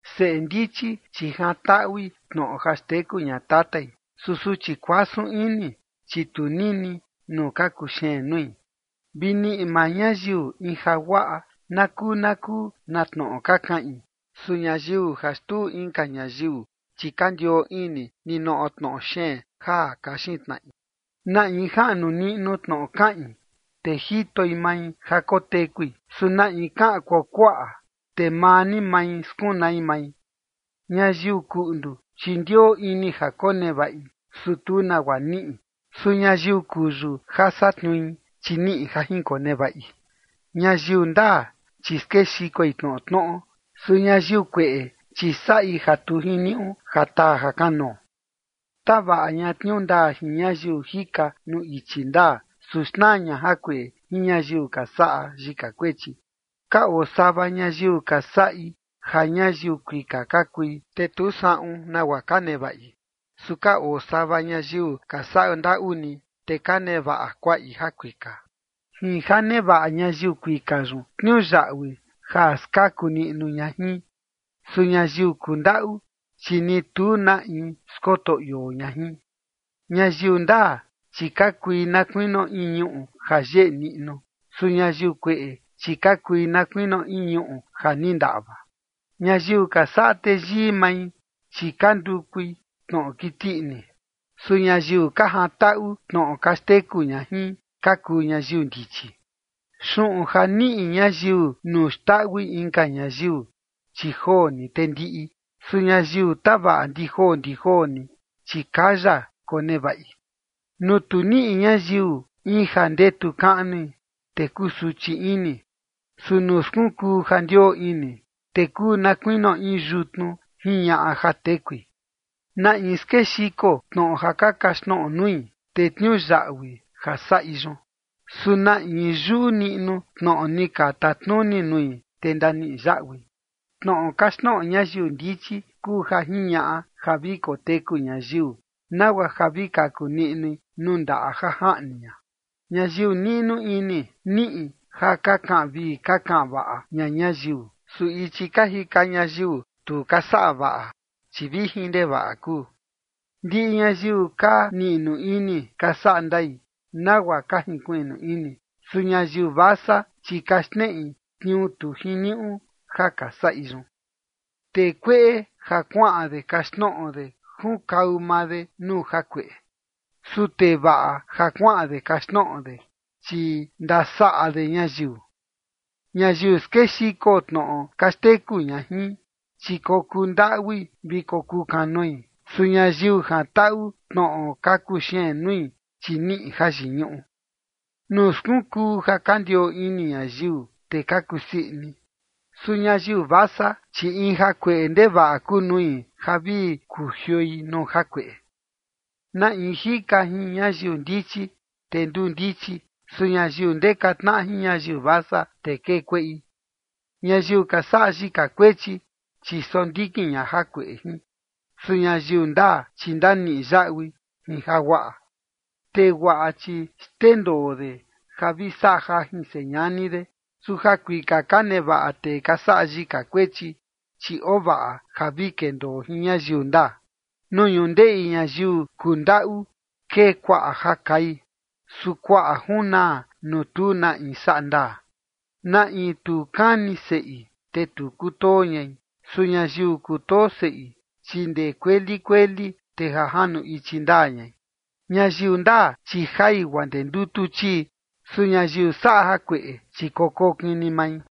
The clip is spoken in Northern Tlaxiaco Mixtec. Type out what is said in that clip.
Seꞌe ndichi, chi jantaꞌui tnoꞌo ja xteku ña tatai. Su suchi kuasun ini, chi tu nini nuu ka kuxeen nui. Vi niꞌi maa ñayiu in jaguaꞌa na kuu na kuu na tnoꞌo ka kaꞌin. Su ñayiu ja xtuu inka ñayiu, chi ka ndioo ini ninoꞌo tnoꞌo xeen ja kaxin tnaꞌi. Na in jaꞌnu niꞌnu tnoꞌo kaꞌin, te jitoi mai ja kotekui. Su na in kaꞌan kuakuaꞌa, te maa ni mai skunai mai. Ñayiu kuꞌndu, chi ndioo ini ja konevaꞌi, su tu nagua niꞌi. Su ñayiu kuyu ja satniui, chi niꞌi ja jinkonevaꞌi. Ñayiu ndaa, chi skexikoi tnoꞌo tnoꞌo. Su ñayiu kueꞌe, chi saꞌi ja tu jiniuꞌu ja taa jakanoo. Tavaꞌa ña tniuu ndaa jin ñayiu jika nuu ichi ndaa, su xnaa ña jakueꞌe jin ñayiu ka saꞌa yika kuechi. Ka oo sava ñayiu ka saꞌi ja ñayiu kuika ka kui, te tu saꞌun nagua ka nevaꞌi. Su ka oo sava ñayiu ka saꞌa ndaꞌu ni, te ka nevaꞌa kuaꞌi jakuika. Jin ja nevaꞌa ñayiu kuika yun tniuyaꞌui ja skaku niꞌnu ña jin. Su ñayiu kundaꞌu, chi ni tu na in skoto ioo ña jin. Ñayiu ndaa, chi ka kui na kuinio in ñuꞌu ja yeꞌe niꞌnu. Su ñayiu kueꞌe, chi ka kui na kuinio in ñuꞌu ja ni ndaꞌva. Ñayiu ka saꞌa teyii mai, chi ka ndukui tnoꞌo kiti ini. Su ñayiu ka jantaꞌu tnoꞌo ka xteku ña jin ka kuu ñayiu ndichi. Xuꞌun ja niꞌi ñayiu nuu xndaꞌui inka ñayiu, chi joo ni te ndiꞌi. Su ñayiu tavaꞌa ndi joo ndi joo ni, chi kaya konevaꞌi. Nuu tu niꞌi ñayiu in ja ndetu kaꞌnui, te kusuchi ini. Su nuu skunkuu ja ndioo ini, te kuu na kuinio in yutnu jiñaꞌa ja tekui. Na in skexiko tnoꞌo ja ka kaxtnoꞌo nui, te tniuyaꞌui ja saꞌi yun. Su na in yuꞌu niꞌnu tnoꞌo ni ka tatnuni nui, te ndaniꞌi yaꞌui. Tnoꞌo kaxtnoꞌo ñayiu ndichi kuu ja jiñaꞌa ja vi koteku ñayiu, nagua ja vi kaku niꞌnui nuu ndaꞌa ja jaꞌni ña. Ñayiu niꞌnu ini niꞌi ja ka kaꞌan vii ka kaꞌan vaꞌa ña ñayiu. Su ichi ka jika ñayiu tu ka saꞌa vaꞌa, chi vijin ndevaꞌa kuu. Ndiꞌi ñayiu ka niꞌnu ini ka saꞌa ndai, nagua ka jinkuiꞌnu ini. Su ñayiu vasa, chi ka xneꞌi tniuu tu jiniuꞌu ja ka saꞌi yun. Tee kueꞌe ja kuaꞌan de kaxtnoꞌo de junkau maa de nuu jakueꞌe. Su tee vaꞌa ja kuaꞌan de kaxtnoꞌo de, chi ndasaꞌa de ñayiu. Ñayiu skexiko tnoꞌo ka xteku ña jin, chi kokuu ndaꞌui vi kokuu kanoi. Su ñayiu jantaꞌu tnoꞌo ka kuxeen nui, chi niꞌi jayiñuꞌu. Nuu skunkuu ja ka ndioo ini ñayiu, te ka kusii ini. Su ñayiu vasa, chi in jakueꞌe ndevaꞌa kuu nui ja vi kujioi nuu jakueꞌe. Na in jika jin ñayiu ndichi, te nduu ndichi. Su ñayiu ndeka tnaꞌa jin ñayiu vasa, te kee kueꞌi. Ñayiu ka saꞌa yika kuechi, chi sondikin ña jakueꞌe jin. Su ñayiu ndaa, chi ndaniꞌi yaꞌui in jaguaꞌa. Tee guaꞌa, chi xndendoo de ja vi saꞌa jajin señani de. Su jakuika ka nevaꞌa tee ka saꞌa yika kuechi, chi ovaꞌa ja vi kendoo jin ñayiu ndaa. Nuu ñundeꞌi ñayiu kundaꞌu kee kuaꞌa ja kai. Su kuaꞌa junaa nuu tu na in saꞌa ndaa. Na in tu kani seꞌi, te tu kutoo ñai. Su ñayiu kutoo seꞌi, chi ndee kueli kueli, te ja janu ichi ndaa ñai. Ñayiu ndaa, chi jai guaa ndee ndutu chii. Su ñayiu saꞌa jakueꞌe, chi kokokin ni mai.